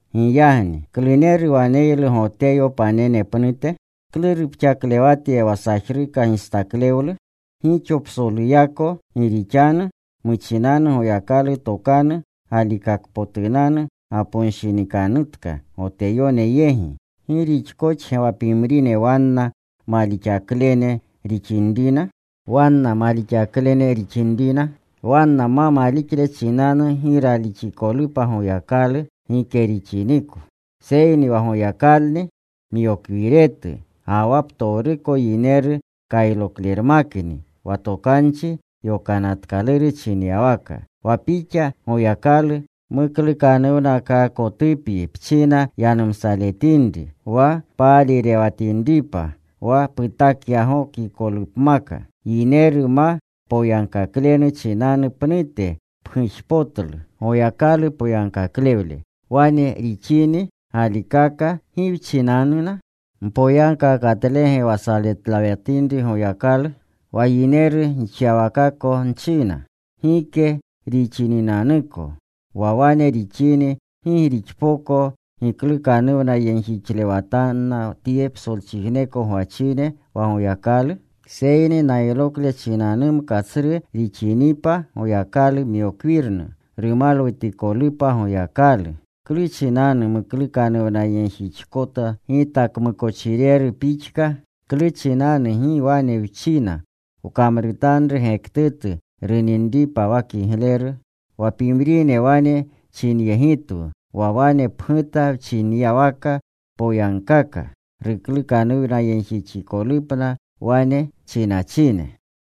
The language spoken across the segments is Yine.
¿Giyagni kluneru waneylu Goteyo panene pnute? ¿Klu rupxaklewata wa sajruka gistaklewlu? Gixo psoluyako. Gi rixanu muchinanu Goyakalu tokanu galikakpotunanu gaponshinikanutka Goteyone yegi. ¿Gi rixkoxge wa pimrine wanna malixaklene rixinrina? ¿Wanna ma malixle chinanu gi ralixikolupa Goyakalu? Gike rixiniko. Seyni wa Goyakalni myokwiretu ga wa ptowruko yineru kayloklerunmakni, wa tokanchi yonatkaluru chinyawaka: Wa Pixa, Goyakalu, muklukanuwnakaakotupyi pchina yanumsaletinri; Wa paalirewatinripa wa putakyagokikolupmaka. Yineru ma poyagkaklenu chinanu pnute pgujpotlu Goyakalu poyagkaklewle. Wane rixini galikaka, ¿gi wchinanuna? ¿Mpoyagkaakatlege wa saletlewatinri Goyakalu? (Wa yineru gixyawakako nchina.) Gike rixininanuko. Wa wane rixini ¿gi rixpoko giklukanuwnayegjixletanna tye psolchijneko gwachine wa Goyakalu? Seyni naylokle chinanumka tsru rixinipa Goyakalu myokwirnu, rumalwutikolupa Goyakalu, ¿klu chinanu nuklukanuwnayegjixkota gita kmukochireru pixka? ¿Klu chinanu gi wane wchina, “Wkamrutanru gektutu runinripa wa kigleru”? wa pimrine wane chinyegitwu wa wane pguta wchinyawaka. Poyagkaaka ruklukanuwnayegjixikolupna wane chinachine.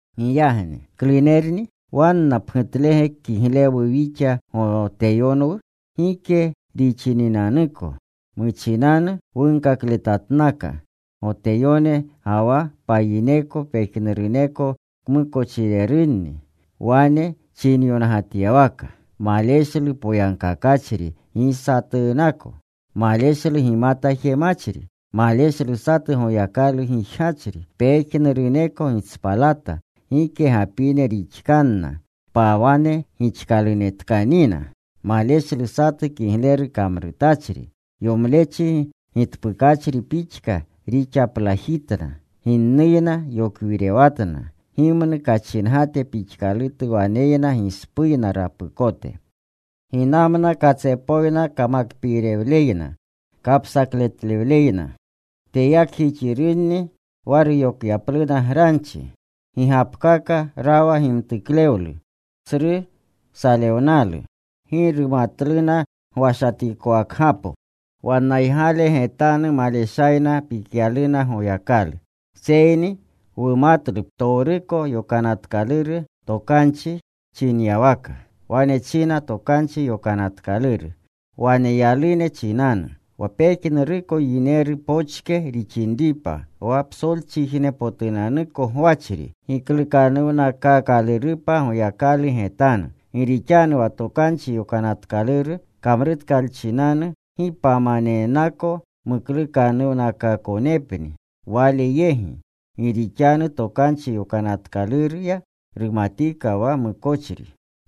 Giyagni ¿klunerni? ¿Wanna pnutlege kiglewu wixa Goteyonwu? Gike rixininanuko. Muchinanu wunkakletanatkana Goteyone, ga wa payineko, pejnuruneko kmukochirerunni. Wane chinyongatyawaka: Maleshlu poyagkakachri, gi satunako. Maleshlu gimata jemachri. Maleshlu satu Goyakalu gijgachri. Pejnuruneko gitspalata. Gike gapine rixkanna. Pawane gixkalunenatkanina. Maleshlu satu kigleru kamrutachri. Yomlechi gitpukachri pixka rixaplajitna. Ginnuyna yokwirewatna. Gimnu kachingate pixkalutu waneyna gispuyna rapukote. Ginamna katsepoyna kamakpiirewleyna, kapsakletlewleyna. Teyaknanjixirunni wa ruyokyapluna granchi. Gigapkaka rawa gimtuklewlu, tsru salewnalu. Gi rumatluna gwashatikowakgapo. Wannaygale getanu maleshayna pikyaluna Goyakalu. Seyni wumatlu ptowruko Yokanatkaluru Tokanchi chinyawaka, wane china Tokanchi Yokanatkaluru waneyalune chinanu, wa pejnuruko yineru pokche rixinripa wa psolchijnepotunanuko gwachri giklukanuwnakaakalurupa Goyakalu getanu. Gi rixanu wa Tokanchi Yokanatkaluru kamrutkalchinanu gi pamanennako muklukanuwnakaakonepni Wale yegi. Gi rixanu Tokanchi Yokanatkaluruya rumatika wa mukochri.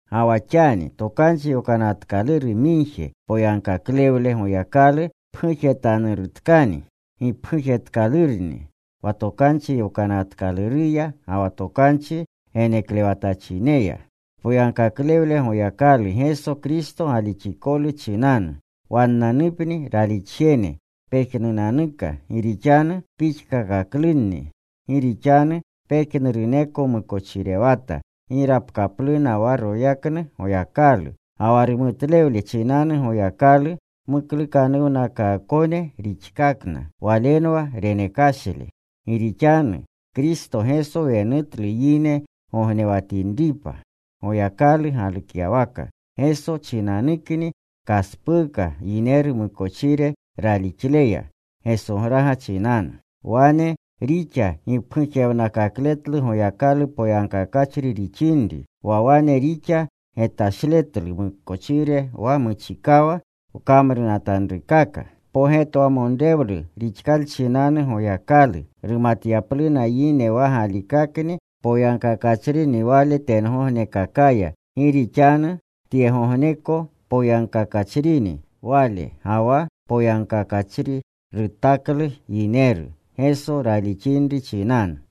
Ga wa xani Tokanchi Yokanatkaluru migje poyagkaklewle Goyakalu pgujetanurutkani. Gipgujtatkalurni wa Tokanchi Yokanatkaluruya ga wa tokanchi geneklewatachineya. Poyagkaklewle Goyakalu, Geso Kristo galixikolu chinanu, wannanupni ralixjene pejnunanuka. Gi rixanu pixkakaklunni. Gi rixanu pejnuruneko mukochirewata. Gi rapkapluna wa royaknu Goyakalu. Ga wa rumutlewle chinanu Goyakalu muklukanuwnakaakone rixkakna. Walenwa renekashle, gi rixanu Kristo Geso wenutlu yine gognewatinripa. Goyakalu galukyawaka, Geso chinanukni kaspuuka yineru mukochire ralixleya, Gesograga chinanu. Wane rixa gipgujewnakakletlu Goyakalu poyagkakachri rixinri, wa wane rixa getashletlu wmukochire wa muchikawa wkamrutanrukaka. Pogetwamonrewlu rixkalchinanu Goyakalu, rumatyapluna yine wa galikakni poyagkakachrini Wale tyegognekakaya, gi rixanu tyegogneko poyagkakachrini Wale, ga wa poyagkakachri rutaklu yineru, Geso ralixinri chinanu.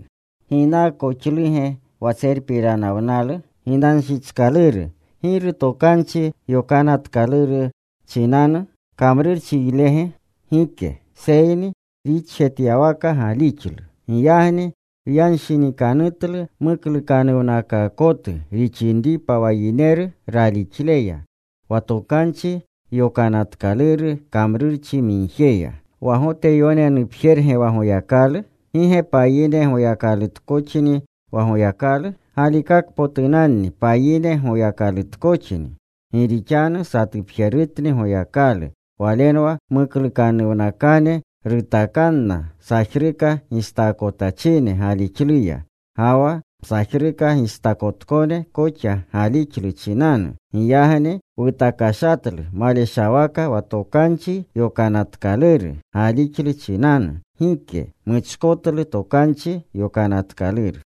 ¿Ginaakoxluge wa tserpiranawnalu? Ginanshichkaluru. ¿Giru Tokanchi Yokanatkaluru chinanu? ¿Kamrurchiylege? Gike. Seyni rixjetyawaka galixlu. Giyagni wyanshinikanutlu muklukanuwnakaakotu rixinripa wa yineru ralixleya, wa Tokanchi Yokanatkaluru kamruremigjeya. ¿Wa Goteyonenupjerge wa Goyakalu? ¿Gi ge payine Goyakalutkoxni wa Goyakalu? Galikakpotunanni payine Goyakalutkoxni. Gi rixanu satupjerutni Goyakalu. Walenwa muklukanuwnakane rutakanna sajruka gistaakotachine galixluya, ga wa msajruka gistaakotkone koxa galixlu chinanu. ¿Giyagni wutakashatlu maleshawaka wa Tokanchi Yokanatkaluru galixlu chinanu? Gike. Wmuchkotlu Tokanchi Yokanatkaluru.